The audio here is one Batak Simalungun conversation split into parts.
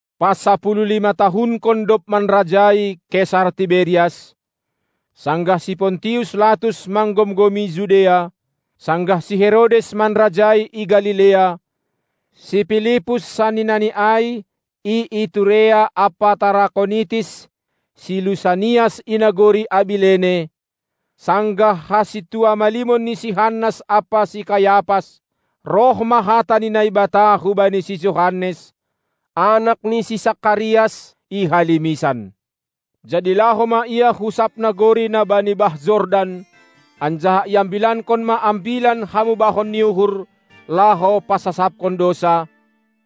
Pasapuluh-lima-tahunkon dob manrajai Kesar Tiberias, sanggah si Pontius Latus manggomgomi Judea, sanggah si Herodes manrajai i Galilea, si Pilipus saninani ai i Iturea ampa Tarakonitis, si Lusanias i nagori Abilene, sanggah hasintua-malimon ni si Hannas ampa si Kayapas, roh ma hata ni Naibata hubani si Johannes, anak ni si Sakarias, i halimisan. Jadi laho ma ia hu sab nagori na bani bah Jordan, anjaha iambilankon ma ambilan hamubahon ni uhur, laho pasasapkon dousa,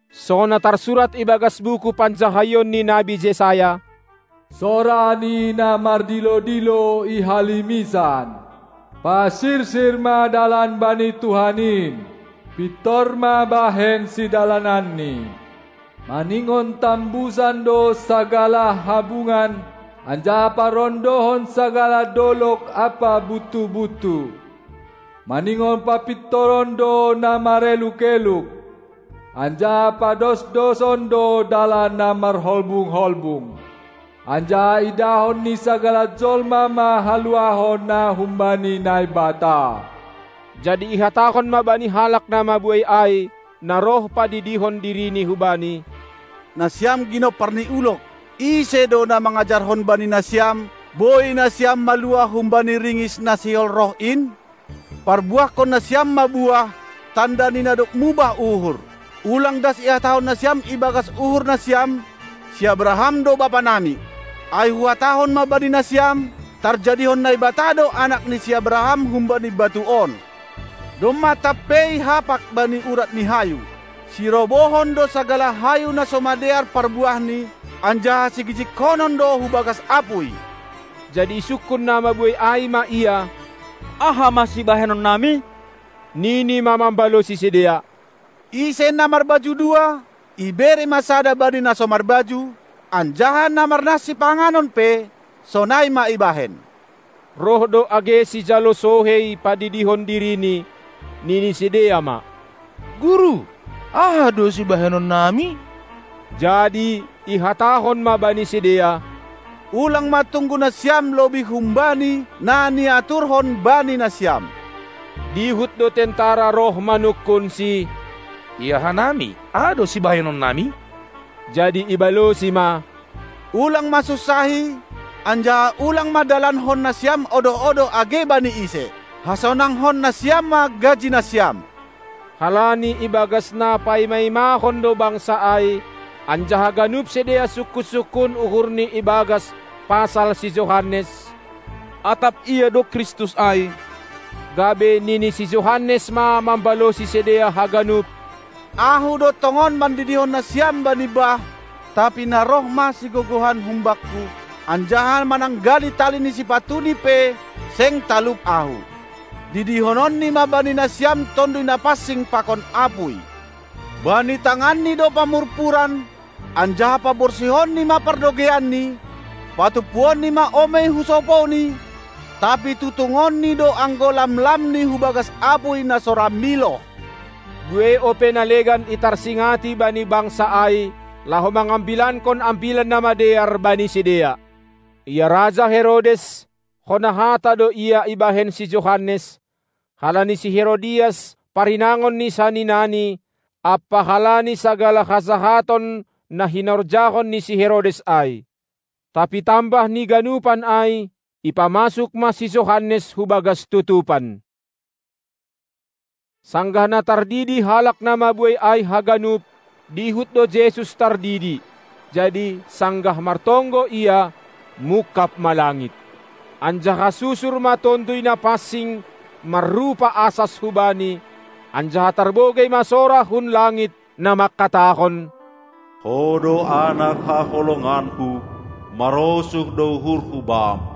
songon na tarsurat ibagas buku panjahaion ni nabi Jesayas: Sora ni na mardilo-dilo i halimisan: Parsirsir ma dalan bani Tuhan in, pintor ma bahen sidalananni! Maningon tambusan do sagala habungan anjaha parondohon sagala dolog ampa buttu-buttu; maningon papintoron do na mareluk-eluk, anjaha padosdoson do dalan na marholbung-holbung. Anjaha idahon ni sagala jolma ma haluahon na humbani Naibata! Jadi ihatahon ma bani halak na mabuei ai na roh padidihon dirini hubani: Nasiam ginompar ni ulog! Ise do na mangajarhon bani nasiam, boi nasiam maluah humbani ringis na sihol roh in? Parbuahkon nasiam ma buah, tanda ni na dob mubah uhur! Ulang das ihatahon nasiam ibagas uhur nasiam: Si Abraham do bapa nami! Ai huhatahon ma bani nasiam, tarjadihon Naibata do anak ni si Abraham humbani batu on. Domma tampei hapak bani urat ni hayu. Sirobohon do sagala hayu na so madear parbuahni, anjaha sigijigkonon do hubagas apuy. Jadi isungkun na mabuei ai ma ia; Aha ma sibahenon nami? Nini ma mambalosi sidea: Ise na marbaju dua, ibere ma sada bani na so marbaju, anjaha na marnah sipanganon pe, sonai ma ibahen. Roh do age sijalo sohei padidihon dirini, nini sidea ma: Guru, aha do sibahenon nami? Jadi ihatahon ma bani sidea: Ulang ma tunggu nasiam lobih humbani na niaturhon bani nasiam! Dihut do tentara roh manungkunsi: Ia hanami, aha do sibahenon nami! Jadi ibalosi ma: Ulang ma sunsahi, anjaha ulang ma dalankon nasiam odoh-odoh age bani ise! Hasonangkon nasiam ma gaji nasiam! Halani ibagas na paima-imahon do bangsa ai, anjaha ganup sidea sungkun-sungkun uhurni ibagas pasal si Johannes, atap ia do Kristus ai, gabe nini si Johannes ma mambalosi sidea haganup: Ahu do tongon mandidihon nasiam bani bah, tapi na roh ma sigogohan humbakku, anjaha mananggali tali ni sipatu-Ni pe seng talup ahu. Didihononni ma bani nasiam Tonduy Napansing pakon apuy. Bani tanganNi do pamurpuran, anjaha paborsihonNi ma pardogeianNi; patumpuonNi ma omei husopouNi, tapi tutungonNi do anggo lam-lamni hubagas apuy na so ra miloh. Buei ope na legan itarsingati bani bangsa ai, laho mangambilankon Ambilan Namadear bani sidea. Ia raja Herodes, hona hata do ia ibahen si Johannes, halani si Herodias, parinangon ni saninani, ampa halani sagala hajahaton na hinorjahon ni si Herodes ai. Tapi tambah ni ganupan ai, ipamasuk ma si Johannes hubagas tutupan. Sanggah na tardidi halak na mabuei ai haganup, dihut do Jesus tardidi. Jadi, sanggah martonggo Ia, mungkab ma langit. Anjaha susur ma Tonduy Napansing marrupa asas hu Bani, anjaha tarbogei ma sora hun langit, na mangkatahon: Ho do anak haholonganKu, marosuh do uhurHu Bam!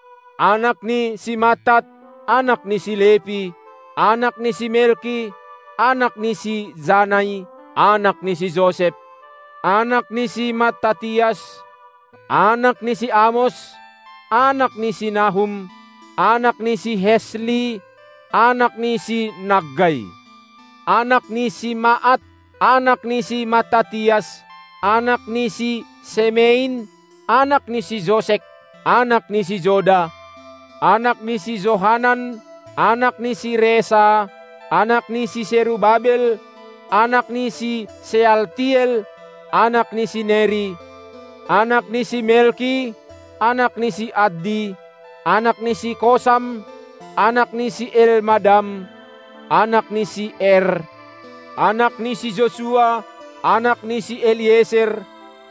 anak ni si Mattat, anak ni si Lepi, anak ni si Melki, anak ni si Janai, anak ni si Josep, anak ni si Mattatias, anak ni si Amos, anak ni si Nahum, anak ni si Hesli, anak ni si Naggai, anak ni si Maat, anak ni si Mattatias, anak ni si Semein, anak ni si Josek, anak ni si Joda, anak ni si Johanan, anak ni si Resa, anak ni si Serubabel, anak ni si Sealtiel, anak ni si Neri, anak ni si Melki, anak ni si Addi, anak ni si Kosam, anak ni si Elmadam, anak ni si Er, anak ni si Josua, anak ni si Elieser,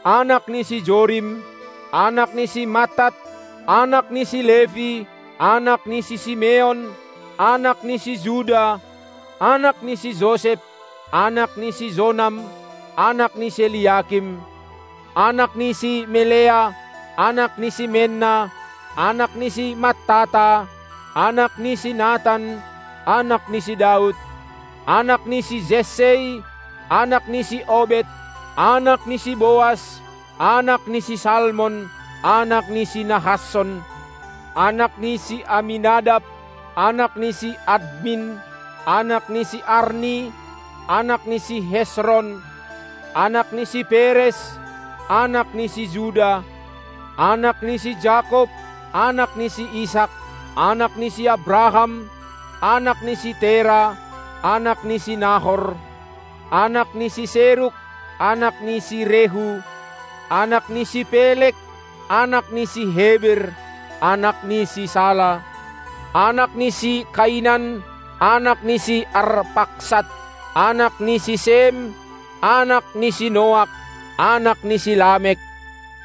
anak ni si Jorim, anak ni si Mattat, anak ni si Lepi, anak ni si Simeon, anak ni si Juda, anak ni si Josep, anak ni si Jonam, anak ni si Eliakim, anak ni si Melea, anak ni si Menna, anak ni si Mattata, anak ni si Natan, anak ni si Daud, anak ni si Jessei, anak ni si Obed, anak ni si Boas, anak ni si Salmon, anak ni si Nahasson, anak ni si Aminadab, anak ni si Admin, anak ni si Arni, anak ni si Hesron, anak ni si Peres, anak ni si Juda, anak ni si Jakob, anak ni si Isak, anak ni si Abraham, anak ni si Tera, anak ni si Nahor, anak ni si Seruk, anak ni si Rehu, anak ni si Peleg, anak ni si Heber, anak ni si Sala; anak ni si Kainan, anak ni si Arpaksad, anak ni si Sem, anak ni si Noak, anak ni si Lamek,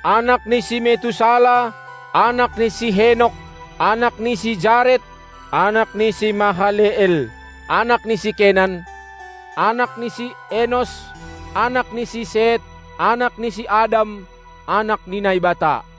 anak ni si Metusala, anak ni si Henok, anak ni si Jared, anak ni si Mahaleel, anak ni si Kenan; anak ni si Enos, anak ni si Set, anak ni si Adam, anak ni Naibata.